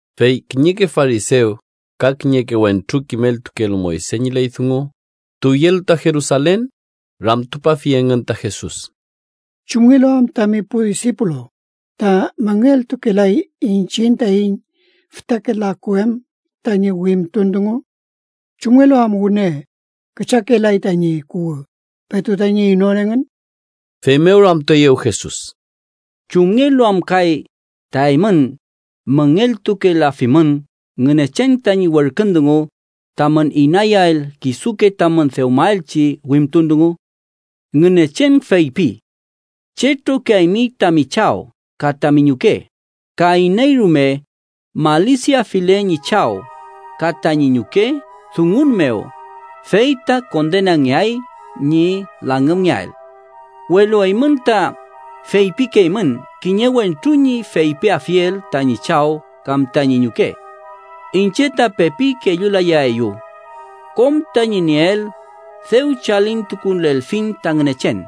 Fey kiñeke farisew ka kiñeke wentru kimeltukelu Moyse ñi ley dungu, tuwyelu ta Jerusalen, ramtupafi engün ta Jesus: —¿Chumngelu am tami pu disipulu ta müngeltukelay iñchiñ taiñ fütake laku em tañi wimtun dungu? ¿Chumngelu am wüne küchakelay tañi kuwü petu tañi inon engün? Feymew ramtueyew Jesus: —¿Chumngelu am kay ta eymün müngeltukelafimün Ngünechen tañi werkün dungu tamün inayael kisuke tamün dewmaelchi wimtun dungu? Ngünechen feypi: ‘Chetrokiaymi tami chaw ka tami ñuke,’ ka ‘iney rume malisiafile ñi chaw ka tañi ñuke dungun mew fey ta kondenangeay ñi langümngeael’. Welu eymün ta feypikeymün kiñe wentru ñi feypiafiel tañi chaw kam tañi ñuke: ‘Iñche ta pepi kellulayaeyu. Kom tañi nieel dew chalintukulelfiñ ta Ngünechen’.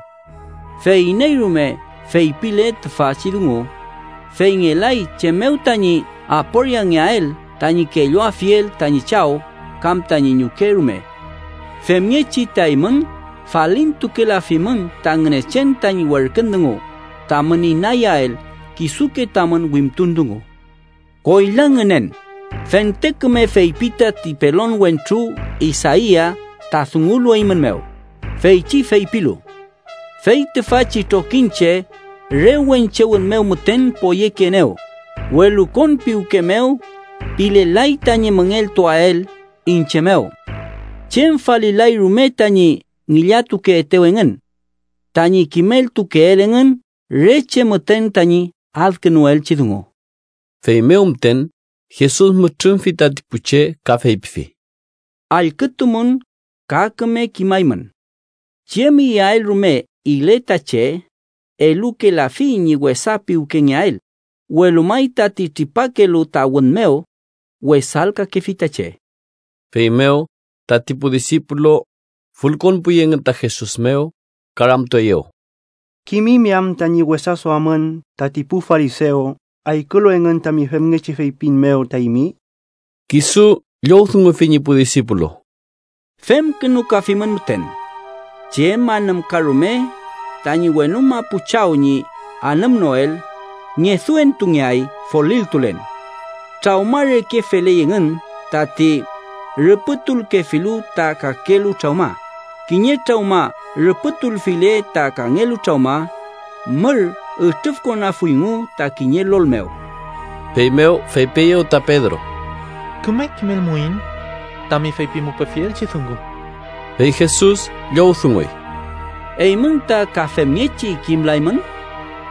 Fey iney rume feypile tüfachi dungu, fey ngelay chem mew tañi aporiangeael tañi kelluafiel tañi chaw kam tañi ñuke rume. Femngechi ta eymün falintukelafimün ta Ngünechen tañi werkün dungu tamün inayael kisuke tamün wimtun dungu. ¡Koyla ngünen! Fente küme feypi tati pelon wentru Isaia ta dungulu eymün mew, feychi feypilu: ‘Fey tüfachi trokiñche re wenche wün mew müten poyekeenew, welu konpiwke mew pilelay tañi müngeltuael iñche mew. Chem falilay rume tañi ngillatukeetew engün. Tañi kimeltukeel engün re che müten tañi adkünuelchi dungu.’ Feymew müten Jesus mütrümfi tati pu che ka feypifi: —Allkütumün ka küme kimaymün: Chem iyael rume ile ta che elukelafi ñi wesa piwkengeael, welu may tati tripakelu ta wün mew wesalkakefi ta che. Feymew tati pu disipulu fülkonpuy engün ta Jesus mew ka ramtueyew: —¿Kimimi am tañi wesa duamün tati pu farisew allkülu engün tami femngechi feypin mew ta eymi? Kisu llowdungufi ñi pu disipulu: —Femkünukafimün müten. Chem anümka rume tañi wenu mapu Chaw ñi anümnoel, ngeduentungeay folilkülen. Trawma reke feley engün, tati rüpütulkefilu ta kakelu trawma. Kiñe trawma rüpütulfile ta kangelu trawma, mür ütrüfkonafuyngu ta kiñe lol mew. Feymew feypieyew ta Pedro: —Küme kimelmuiñ tami feypimupefielchi dungu. Fey Jesus llowdunguy: —¿Eymün ta ka femngechi kimlaymün?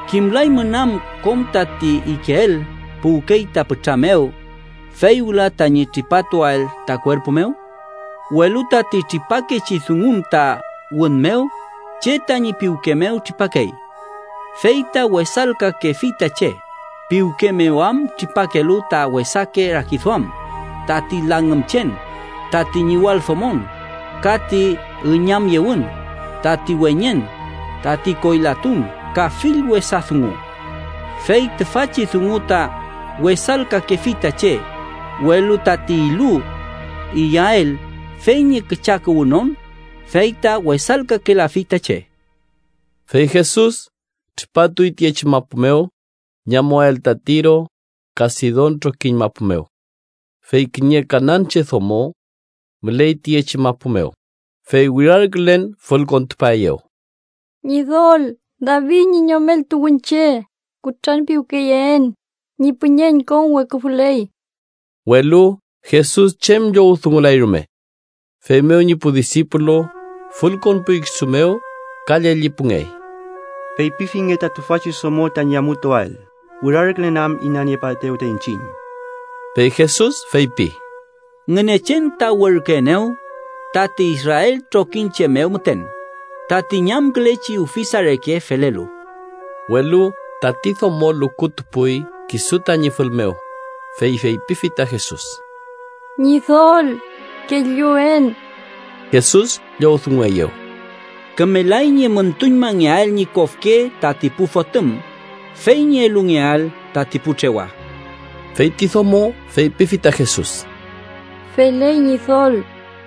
¿Kimlaymün am kom tati ikeel puwkey ta pütra mew, fey wüla tañi tripatuael ta kuerpu mew? Welu tati tripakechi dungun ta wün mew, che tañi piwke mew tripakey. Fey ta wesalkakefi ta che, piwke mew am tripakelu ta wesake rakiduam, tati langümchen, tati ñiwaldomon, ka ti üñamyewün, tati weñen, tati koylatun ka fill wesa dungu. Fey tüfachi dungu ta wesalkakefi ta che, welu tati ilu iyael fey ñi küchakuwünon, fey ta wesalkakelafi ta che. Fey Jesus tripatuy tiyechi mapu mew ñi amuael ta Tiro ka Sidon trokiñ mapu mew. Fey kiñe kananche domo müley tiyechi mapu mew, fey wirarkülen fülkontupaeyew: —¡Ñidol, David ñi Yomel tuwünche, kutranpiwkeyeen! ¡Ñi püñeñ konweküfüley! Welu Jesus chem llowdungulay rume. Feymew ñi pu disipulu fülkonpuy kisu mew ka llellipungey: —Feypifinge ta tüfachi domo tañi amutuael, wirarkülen am inaniepaetew ta iñchiñ. Fey Jesus feypi: —Ngünechen ta werküenew tati Israel trokiñche mew müten, tati ñamkülechi ufisa reke felelu. Welu tati domo lukutupuy kisu tañi fül mew, fey feypifi ta Jesus: —¡Ñidol, kelluen! Jesus llowdungueyew: —Kümelay ñi müntuñmangeael ñi kofke tati pu fotüm fey ñi elungeael tati pu trewa. Fey ti domo feypifi ta Jesus: —Feley, Ñidol,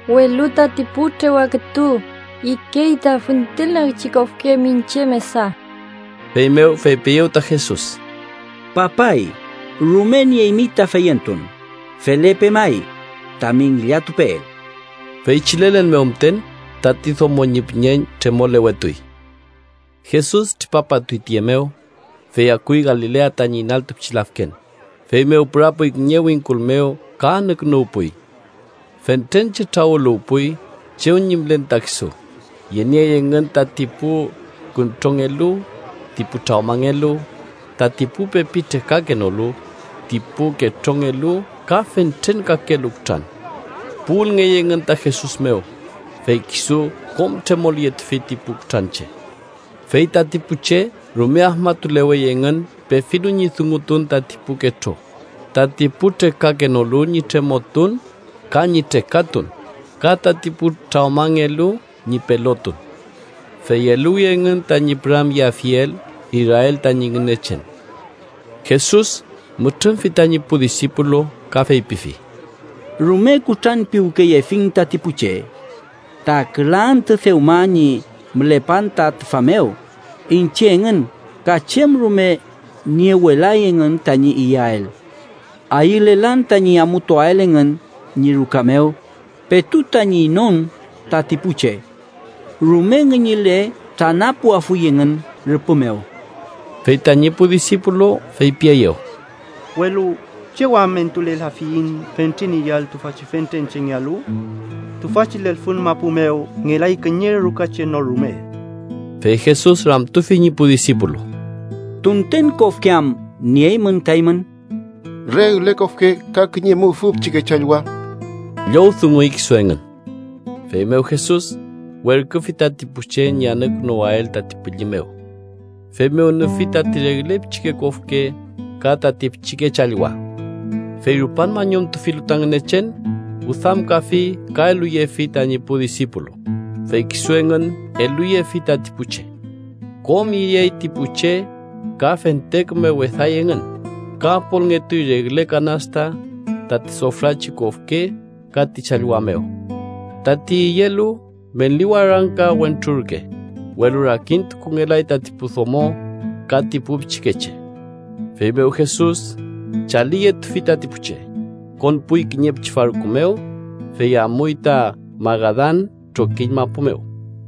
welu tati pu trewa kütu ikey ta füntülnagchi kofke miñche mesa. Feymew feypieyew ta Jesus: —¡Papay, rume nieymi ta feyentun! Felepe may tami ngillatupeel. Feychi lelen mew müten tati domo ñi püñeñ tremolewetuy. Jesus tripapatuy tiye mew, fey akuy Galilea tañi inaltu pichi lafken, feymew pürapuy kiñe wingkul mew ka anükünuwpuy. Fentren che trawüluwpuy chew ñi mülen ta kisu, yeniey engün tati pu küntrongelu, ti pu trawmangelu, tati pu pepi trekakenolu, ti pu ketrongelu ka fentren kakelu kutran. Puwülngey engün ta Jesus mew, fey kisu kom tremolyetufi ti pu kutranche. Fey tati pu che rume afmatulewey engün pefilu ñi dungutun tati pu ketro, tati pu trekakenolu ñi tremotun ka ñi trekatun, ka tati pu trawmangelu ñi pelotun. Fey eluwi engün tañi püramyeafiel Israel tañi Ngünechen. Jesus mütrümfi tañi pu disipulu, ka feypifi: —Rume kutranpiwkeyefiñ tati pu che ta küla antü dewma ñi mülepan ta tüfa mew iñche engün ka chem rume niewelay engün tañi iyael. Ayülelan tañi amutuael engün ñi ruka mew petu tañi inon tati pu che. Rume ngüñüle tranapuafuy engün rüpü mew. Fey tañi pu disipulu feypieyew: —Welu ¿chew am entulelafiyiñ fentren iyael tüfachi fentren chengealu? Tüfachi lelfün mapu mew ngelay kiñe rukache no rume. Fey Jesus ramtufi ñi pu disipulu: —¿Tunten kofke am nieymün ta eymün? —Regle kofke, ka kiñe mufün pichike challwa ―llowdunguy kisu engün. Feymew Jesus werküfi tati pu che ñi anükünuwael tati pülli mew. Feymew nüfi tati regle pichike kofke ka tati pichike challwa. Fey rupan mañumtufilu ta Ngünechen, wüdamkafi ka eluyefi tañi pu disipulu, fey kisu engün eluyefi tati pu che. Kom iyey ti pu che ka fente küme weday engün, ka apolngetuy regle kanasta tati sofrachi kofke ka ti challwa mew. Tati iyelu meli warangka wentrurke, welu rakintukungelay tati pu domo ka ti pu pichikeche. Feymew Jesus chaliyetufi tati pu che, konpuy kiñe pichi farku mew, fey amuy ta Magadan trokiñ mapu mew.